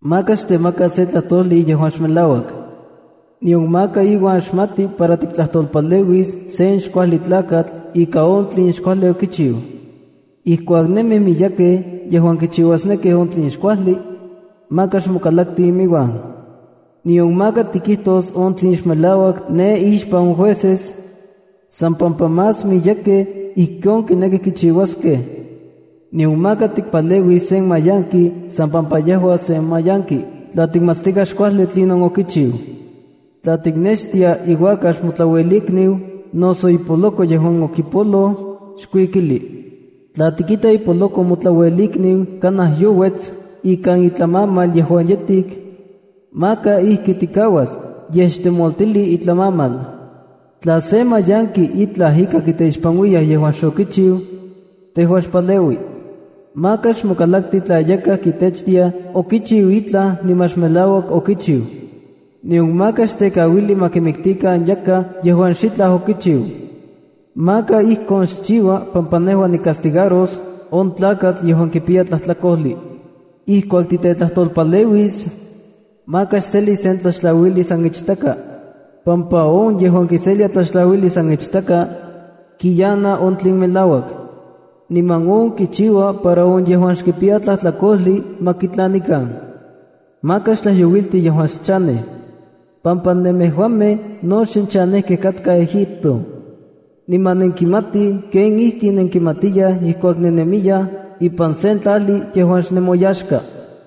’Maka xtemaka sen tlajtojli yejuan xmelauak. Nion maka iuan xmati para tiktlajtolpaleuis sen xkuajli tlakatl ika on tlen xkuajli okichiu. ’Ijkuak nemij miyekej yejuan kichiuasnekij on tlen xkuajli, maka xmokalakti iminuan. “Nion maka tikijtos on tlen xmelauak ne ixpan on jueces san pampa más miyekej ijkon kinekij kichiuaskej. Nion maka tikmanauis sen mayanki san pampa yejua sen mayanki tla tikmatstikaj xkuajli tlinon okichiu. ’Tla tiknextia iuakax motlauelikniu noso ipoloko yejuan okipoloj, xkuikili. Tla tikita ipoloko motlauelikniu kanaj youets ikan itlamamal yejuan yetik, maka ijki tikauas, yej xtemoltili itlamamal. ’Tla sen mayanki itlaj ika kiteixpanuiyaj yejuan xokichiu, tejua xpaleui. ’Maka xmokalakti tla yakaj kitechtiaj okichiu itlaj niman xmelauak okichiu. Nion maka xtekauili ma kimiktikan yakaj yejuan xitlaj okichiu. Maka ijkon xchiua pampa nejua nikastigaros on tlakatl yejuan kipiya tlajtlakojli. ’Ijkuak titetlajtolpaleuis, maka xseli sen tlaxtlauijli san ichtaka, pampa on yejuan kiselia tlaxtlauijli san ichtaka kiyana on tlen melauak, niman on kichiua para on yejuan xkipiya tlajtlakojli ma kitlanikan. ’Maka xtlajyouilti yejuan xchanej, pampa nemejuamej no xnenchanejkej katkaj Egipto. Niman nenkimatij kenijkinenkimatiyaj ijkuak nennemiyaj ipan sen tlajli yejuan xnemoyaxka.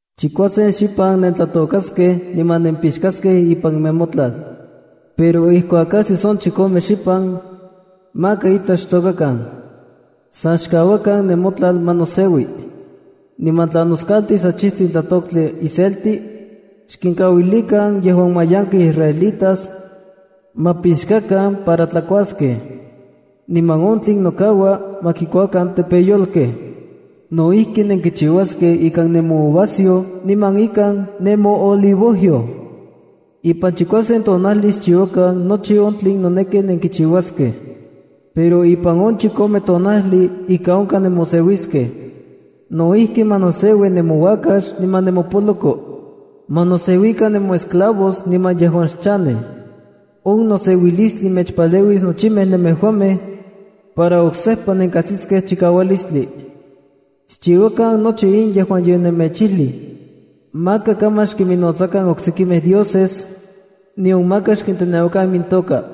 ’Chikuasen xipan nentlatokaskej niman nempixkaskej ipan nemotlal. Pero ijkuak ajsis on chikome xipan, maka itlaj xtokakan. San xkauakan nemotlal ma noseui. Niman tla noskaltis achijtsin tlatoktli iselti, xkinkauilikan yejuan mayankej israelitas ma pixkakan para tlakuaskej. Niman on tlen nokaua ma kuakan tepeyolkej. No ijki, nenkichiuaskej ikan nemouvasayoj niman ikan nemoolivojyoj. ’Ipan chikuasen tonajli xchiuakan nochi on tlen noneki nenkichiuaskej, pero ipan on chikome tonajli ika onkaj nemoseuiskej. No ijki, ma noseui nemouakax niman nemopoloko. Ma noseuikan nemoesclavos niman on yejuan xchanej. On noseuilistli mechpaleuis nochimej nemejuamej para oksejpa nenkajsiskej chikaualistli. ’Xchiuakan nochi in yejuan yonemechijlij. Maka kaman xkinnotsakan oksekimej dioses nion maka xkinteneuakan imintoka.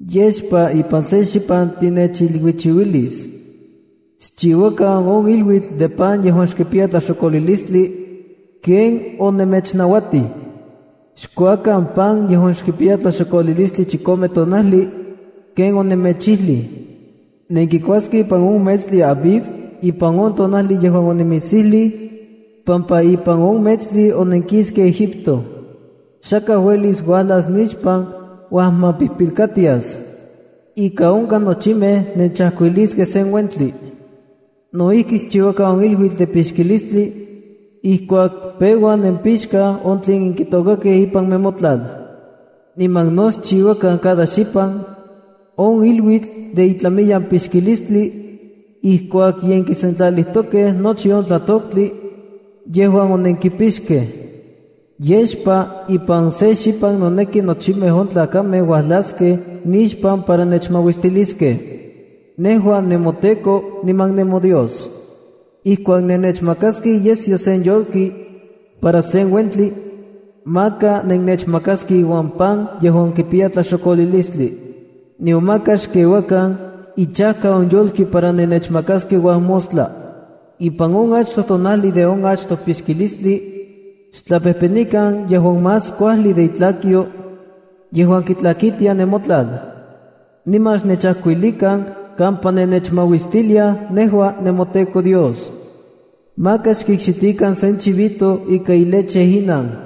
’Yexpa ipan se xipan tinechiluichiuilis. Xchiuakan on iluitl de pan yejuan xkipiya tlaxokolilistli ken onemechnauatij. Xkuakan pan yejuan xkipiya tlaxokolilistli chikome tonajli ken onemechijlij. Nenkikuaskej ipan on metstli Abib ipan on tonajli yejuan onimitsijlij, pampa ipan on metstli onenkiskej Egipto. Xakaj uelis uajlas nixpan uajmapijpilkatias. Ika onkaj nochimej nechajkuilisej sen uentli. ’No ijki, xchiuakan on iluitl de pixkilistli ijkuak peua nenkipixka on tlen onenkitokakej ipan nemotlal. Niman no xchiuakan cada xipan on iluitl de itlamiyan pixkilistli ijkuak ye nenkisentlalijtokej nochi on tlatoktli yejuan onenkipixkej. ’Yexpa ipan se xipan noneki nochimej on tlakamej uajlaskej nixpan para nechmauistiliskej, nejua nemoTEKO niman nemoDios. ’Ijkuak nenechmakaskej iyesyo sen yolki para sen uentli, maka nennechmakaskej iuan pan yejuan kipiya tlaxokolilistli. Nion maka xkeuakan ichajka on yolki para nenechmakaskej uajmostla. ’Ipan on achtoj tonajli de on achtoj pixkilistli, xtlapejpenikan yejuan más kuajli de itlakyo yejuan kitlakitia nemotlal, niman xnechajkuilikan kampa nenechmauistiliaj nejua nemoTEKO Dios. ’Maka xkikxitikan sen chivito ika ileche inan.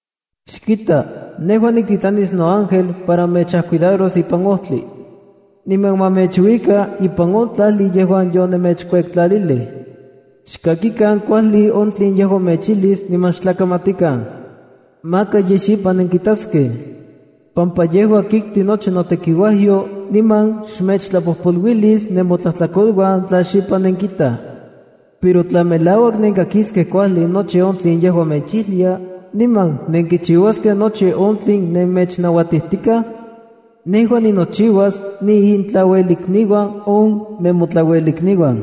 ’Xkita, nejua niktitlanis noángel para ma mechcuidaro ipan ojtli, niman ma mechuika ipan on tlajli yejuan yonemechkuektlalilij. Xkakikan kuajli on tlen yejua mechijlis niman xtlakamatikan. Maka yej xipan nenkitaskej, pampa yejua kikti nochi notekiuajyo niman xmechtlapojpoluilis nemotlajtlakoluan tla xipan nenkitaj. Pero tla melauak nenkakiskej kuajli nochi on tlen yejua mechijlia niman nenkichiuaskej nochi on tlen nemechnauatijtikaj, nejua ninochiuas niintlauelikniuan on nemotlauelikniuan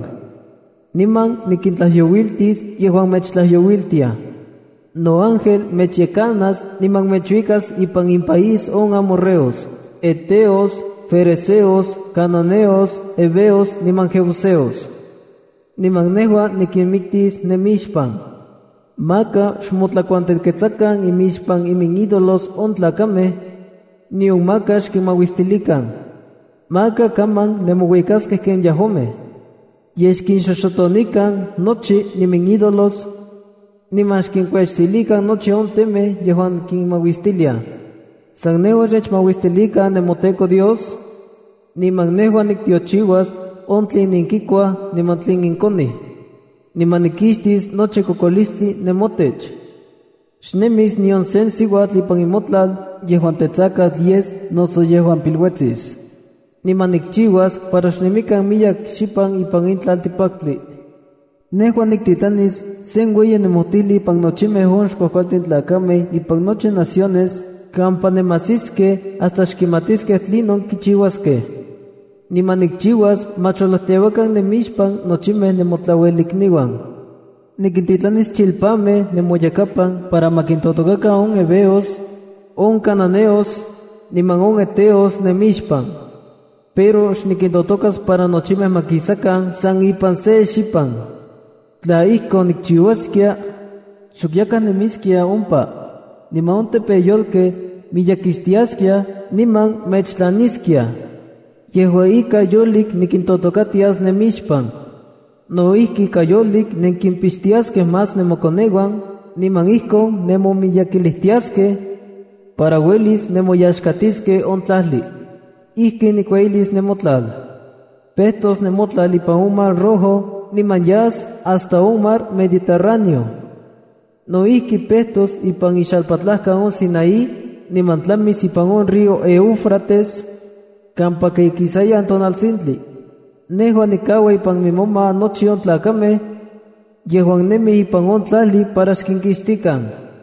niman nikintlajyouiltis yejuan mechtlajyouiltiaj. Noángel mechyekanas niman mechuikas ipan inpaís on amorreos, heteos, ferezeos, cananeos, heveos niman jebuseos. Niman nejua nikinmiktis nemixpan. Maka xmotlakuantelketsakan imixpan iminídolos on tlakamej, nion maka xkinmauistilikan. Maka kaman nemouikaskej ken yejuamej. Yej xkinxoxotonikan nochi iminídolos, niman xkinkuechtilikan nochi on temej yejuan kinmauistiliaj. San nejua xnechmauistilikan, nemoTEKO Dios, niman nejua niktiochiuas on tlen nenkikuaj niman tlen nenkonij. ’Niman nikixtis nochi kokolistli nemotech. Xnemis nion se siuatl ipan nemotlal yejuan tetsakatl yes noso yejuan piluetsis. Niman nikchiuas para xnemikan miyek xipan ipan in tlaltikpaktli. ’Nejua niktitlanis sen ueyi nemojtijli impan nochimej on xkuajkualtin tlakamej ipan nochi naciones kampa nemajsiskej hasta xkimatiskej tlinon kichiuaskej. Niman nikchiuas ma cholojteuakan nemixpan nochimej nemotlauelikniuan. Nikintitlanis chilpanmej nemoyakapan para ma kintotokakan on heveos, on cananeos, niman on heteos nemixpan. Pero xnikintotokas para nochimej ma kisakan san ipan se xipan. Tla ijkon nikchiuaskia, xok yakaj nemiskia ompa, niman on tepeyolkej miyekixtiaskia niman mechtlaniskiaj. Yejua ika, yolik nikintotokatias nemixpan. No ijki, ika yolik nenkimpixtiaskej más nemokoneuan niman ijkon nemomiyekilijtiaskej para uelis nemoyaxkatiskej on tlajli. ’Ijkin nikueyilis nemotlal: Pejtos nemotlal ipan on Mar Rojo niman yas hasta on Mar Mediterráneoa. No ijki, pejtos ipan on xalpatlajkan de Sinaí niman tlamis ipan on río Éufrates kampaka ikisayan tonaltsintli. Nejua nikaua ipan nemoma nochi on tlakamej yejuan nemij ipan on tlajli para xkinkixtikan.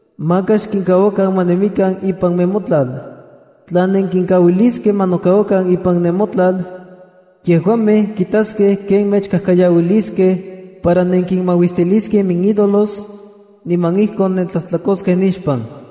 Maka xkinkauakan ma nemikan ipan nemotlal. Tla nenkinkauiliskej ma nokauakan ipan nemotlal, yejuamej kitaskej ken mechkajkayauiliskej para nenkinmauistiliskej iminídolos, niman ijkon nentlajtlakoskej nixpan.”